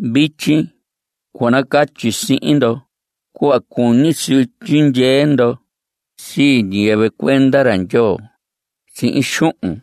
Vityi cua nacatyi sihin ndo cuhva cuñi si tyindyee ndo sii ñiyɨvɨ cuenda ra Ndyoo sihin xuhun.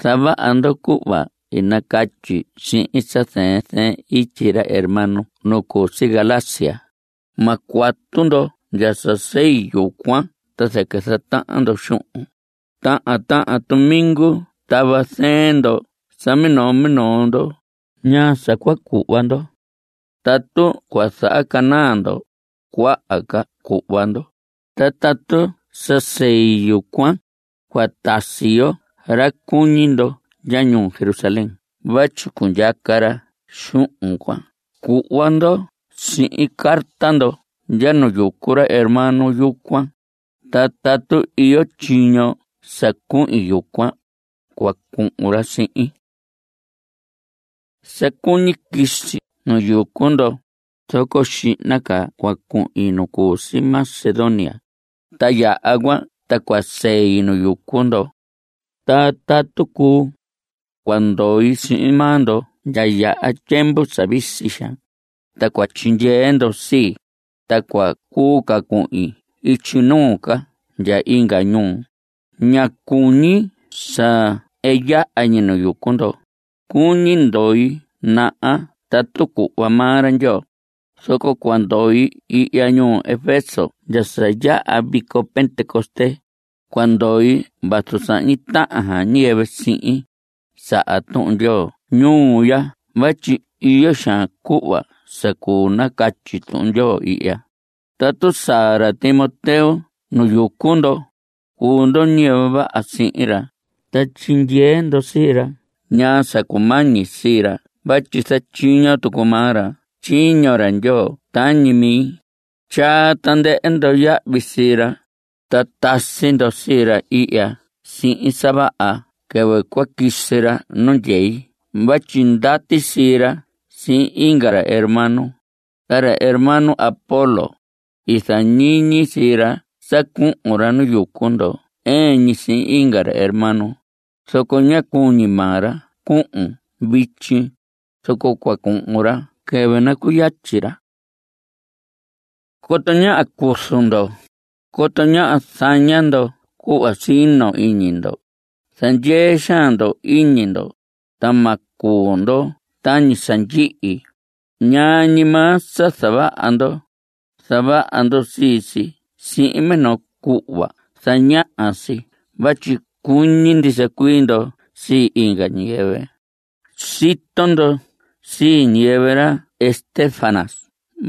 Zavaha ndo cuhva i nacatyi sihin sa zɨɨn zɨɨn ityi ra hermano nu cu si Galacia. Ma cuatu ndo ndya sa sei yucuan ta zɨquɨ zatahan ndo xuhun. Tahan tahan tumingu tava zɨɨn ndo sa minoo minoo ndo ñaa sa cua cuhva ndo. Tatu cuaha ca zahacanaa ndo, cuaha ca cuhva ndo. Ta tatu sa sei yucuan, cua tasi yoo ra cuñi ndo ndya ñuu Jerusalén vatyi cundyaca ra xuhun cua cuhva ndo sihin carta ndo ndya nu yucu ra hermano yucuan. Ta tatu iyo tyiño sa cuhin yucuan, cua cuhun ra sihin. Sa cuñi quisi nu yucu ndo, zoco xihna ca cua cuhin nu cu si Macedonia, ta yaha cuan ta cua sei nu yucu ndo. Ta tatu cuu, cua ndoi sihin maa ndo ndya yaha tyiemvu sa visi xaan. Ta cua tyindyee ndo sii, ta cua cuu ca cuhin ityi nuu ca ndya inga ñuu. Ña cuñi sa ɨɨn yaha ñi nu yucu ndo. Cuñi ndoi naha tatu cuhva maa ra Ndyoo. Zoco cua ndoi ihya ñuu Efeso ndya sa yaha vico Pentecostés. Cua ndoi vazu sahñi tahan xaan ñiyɨvɨ sihin, saha Tuhun Ndyoo ñuu ya vatyi iyo xaan cuhva sa cuu nacatyi Tuhun Ndyoo ihya. Tatu saa ra Timoteo nu yucu ndo, cuu ndo ñiyɨvɨ vaha sihin ra ta tyindyee ndo sii ra ñaa sa cumañi sii ra vatyi zatyiño tucu maa ra tyiño ra Ndyoo tañi mi. Tyaa tandɨhɨ ndo yahvi sii ra, ta tasi ndo sii ra ihya sihin sa vaha quɨvɨ cua quisi ra nu ndyei vatyi ndati sii ra sihin inga ra hermano. Ta ra hermano Apolos, i zañiñi sii ra sa cuhun ra nu yucu ndo ɨɨn ñi sihin inga ra hermano, zoco ñá cuñi maa ra cuhun vityi. Zoco cua cuhun ra quɨvɨ nacuyatyi ra. Coto ñáha cuzu ndo; coto ñáha zaña ndo cuhva sino iñi ndo. Zandyee xaan ndo iñi ndo, ta ma cuu ndo tañi sa ndyihi. Ñaa ñi maa sa zavaha ndo, zavaha ndo sii si sihin minoo cuhva zañaha si vatyi cuñi ndisa cuii ndo sii inga ñiyɨvɨ. Sito ndo sii ñiyɨvɨ ra Estéfanas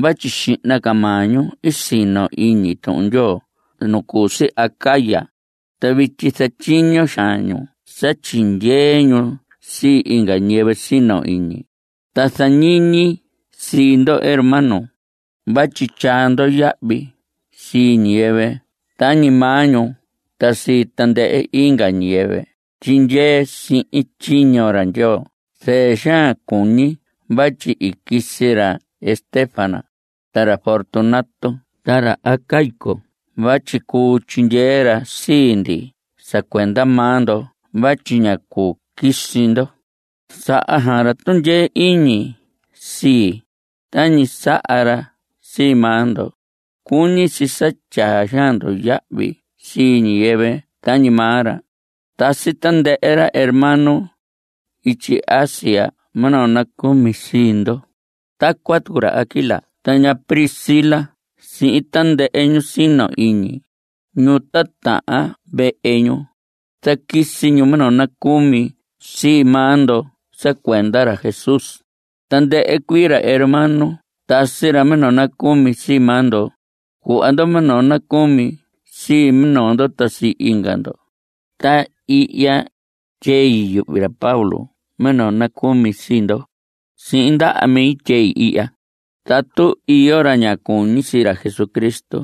vatyi xihna ca maa ñu i sino iñi Tuhun Ndyoo nu cu si Acaya, ta vityi zatyiño xaan ñu sa tyindyee ñu sii inga ñiyɨvɨ sino iñi. Ta zañiñi sii ndo, hermanos, vatyi tyaa ndo yahvi sii ñiyɨvɨ tañi maa ñu ta sii tandɨhɨ inga ñiyɨvɨ tyindyee sihin tyiño ra Ndyoo. Zɨɨ xaan cuñi vatyi i quisi ra Estéfanas, ra Fortunato ta ra Acaico vatyi cuu tyindyee ra sii ndi sa cuenda maa ndo vatyi ñá cuu quisi ndo. Saha xaan ra tundyee iñi sii, tañi saha ra sii maa ndo. Cuñi si sa tyaa xaan ndo yahvi sii ñiyɨvɨ tañi maa ra. Tasi tandɨhɨ ra hermano ityi Asia minoo nacumi sii ndo. Tacuan tucu ra Aquila ta ña Priscila sihin tandɨhɨ ñu sino iñi, ñu titahan vehe ñu, zaquisi ñu minoo nacumi sii maa ndo sa cuenda ra Jesús. Tandɨhɨ cuii ra hermano tasi ra minoo nacumi sii maa ndo. Cuhva ndo minoo nacumi sii minoo ndo ta sii inga ndo. Ta ihya tyei yuhvi ra Pablo minoo nacumi sii ndo. Sihin ndaha mi tyei ihya. Tatu iyo ra ña cuñi sii ra Jesucristo,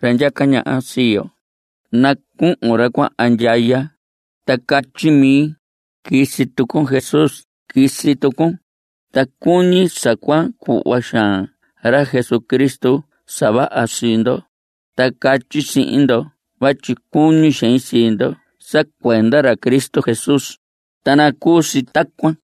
ra ndyaca ñaha sii yo, nacuhun ra cuan andyaya. Ta catyi mi: ¡Quisi tucun Jesús, quisi tucun! Ta cuñi sa cua cuhva xaan ra Jesucristo sa vaha sii ndo. Ta catyi sihin ndo vatyi cuñi xein sii ndo sa cuenda ra Cristo Jesús. Ta nacuu si tacuan.